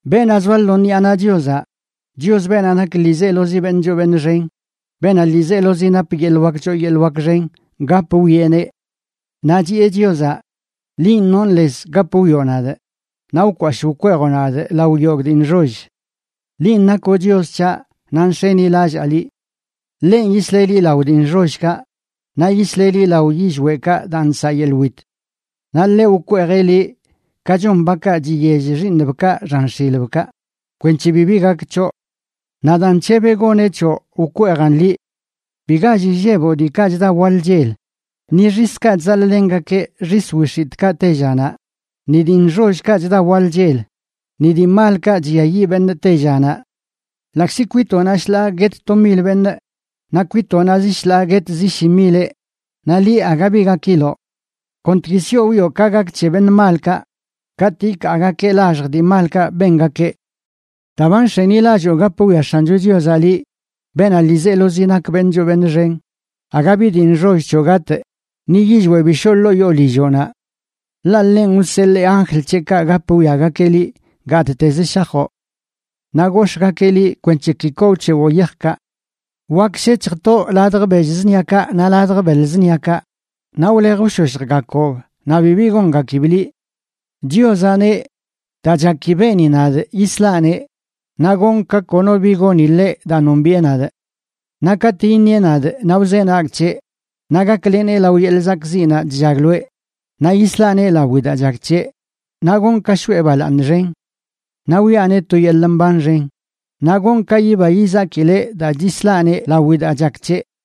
Beenaꞌ zoa lo ṉiꞌa naꞌ Chiozaꞌ, Chios, beenaꞌ nak ḻiizelozi beṉꞌ choo beṉꞌ xen, beenaꞌ ḻiizelozi nap yeḻꞌ wak choo yeḻꞌ wak xen, gap wwieꞌneꞌ. Naꞌ chiꞌe Chiozaꞌ: “Linꞌ nonꞌ lez gap wwioꞌ nadꞌ, naꞌ wkwashꞌ wkweejoꞌ nadꞌ lao yogꞌ dii nxoll. Linꞌ nakoꞌ Chios c̱haꞌ, naꞌ nx̱enilallaa liꞌ.” Ḻenꞌ yisleꞌ liꞌ lao dii nxollkaꞌ, naꞌ yisleꞌ liꞌ lao yillweꞌkaꞌ daa nsaꞌ yeḻꞌ wit. Naꞌ ḻeꞌ wkweejeꞌ liꞌ ka chon bakaꞌ chiyell xiiṉbkaꞌ xan x̱ilbkaꞌ, kwenc̱he bibi gak c̱hoꞌ. Naꞌ daa nc̱hebeꞌ goneꞌ c̱hoꞌ wkweejan liꞌ. Bi gall illeboꞌ diikaꞌ chda waḻ chel, ni xiskaꞌ chzaḻꞌlengakeꞌ xis wix̱itꞌkaꞌ tellanaꞌ, ni dii nxollkaꞌ chda waḻ chel, ni dii malkaꞌ chlliayiꞌn beṉꞌ tellanaꞌ. Ḻaꞌkzi kwitoꞌnaꞌ shḻaa guet to mil beṉꞌ, naꞌ kwitoꞌnaꞌ zi shḻaa guet zi shi mileꞌ, naꞌ liꞌ, aga bi gakiloꞌ. Kontgui sioꞌ wwioꞌ ka gak c̱he beṉꞌ malkaꞌ katꞌ ikaagakeꞌ laxj dii malkaꞌ bengakeꞌ. Daa ba nx̱enilalloo gap wwia X̱ancho Chiozaꞌ liꞌ, beenaꞌ ḻiizelozi nak beṉꞌ choo beṉꞌ xen, aga bi dii nxoll c̱hoꞌ gatꞌ, ni yillweꞌ bi shoꞌ ḻoo yoo lilloꞌnaꞌ. Ḻaꞌ ḻenꞌ wseḻee anjl c̱heꞌkaꞌ gap wwiagakeꞌ liꞌ gattezə shajoꞌ; naꞌ gox̱ꞌgakeꞌ liꞌ kwenc̱he ki koo wc̱hewoꞌ yajkaꞌ. Wak shec̱hj toꞌ ladj bell zṉiakaꞌ naꞌ ladj beḻ zṉiakaꞌ naꞌ wlej wshoshjgakoꞌb naꞌ bibi gongakib liꞌ. Chiozaꞌ neꞌ: “Daa chaki beeni nadꞌ, yislaꞌneꞌ, naꞌ gonꞌ ka kono bi goni ḻeꞌ daa nombiꞌe nadꞌ. Naꞌ katꞌ iṉieꞌ nadꞌ, naꞌ wzenagꞌ c̱heꞌ, naꞌ gaklenee lao yeḻꞌ zakꞌziꞌnaꞌ chllagloeꞌ, naꞌ yislaꞌneꞌ lawi daa chak c̱heꞌ, naꞌ gonꞌ ka shoꞌe balaaṉ xen. Naꞌ wiꞌaneꞌ to yeḻꞌ mban xen naꞌ gonꞌ ka yiba yizakileꞌ daa chislaꞌneꞌ lawi daa chak c̱heꞌ.”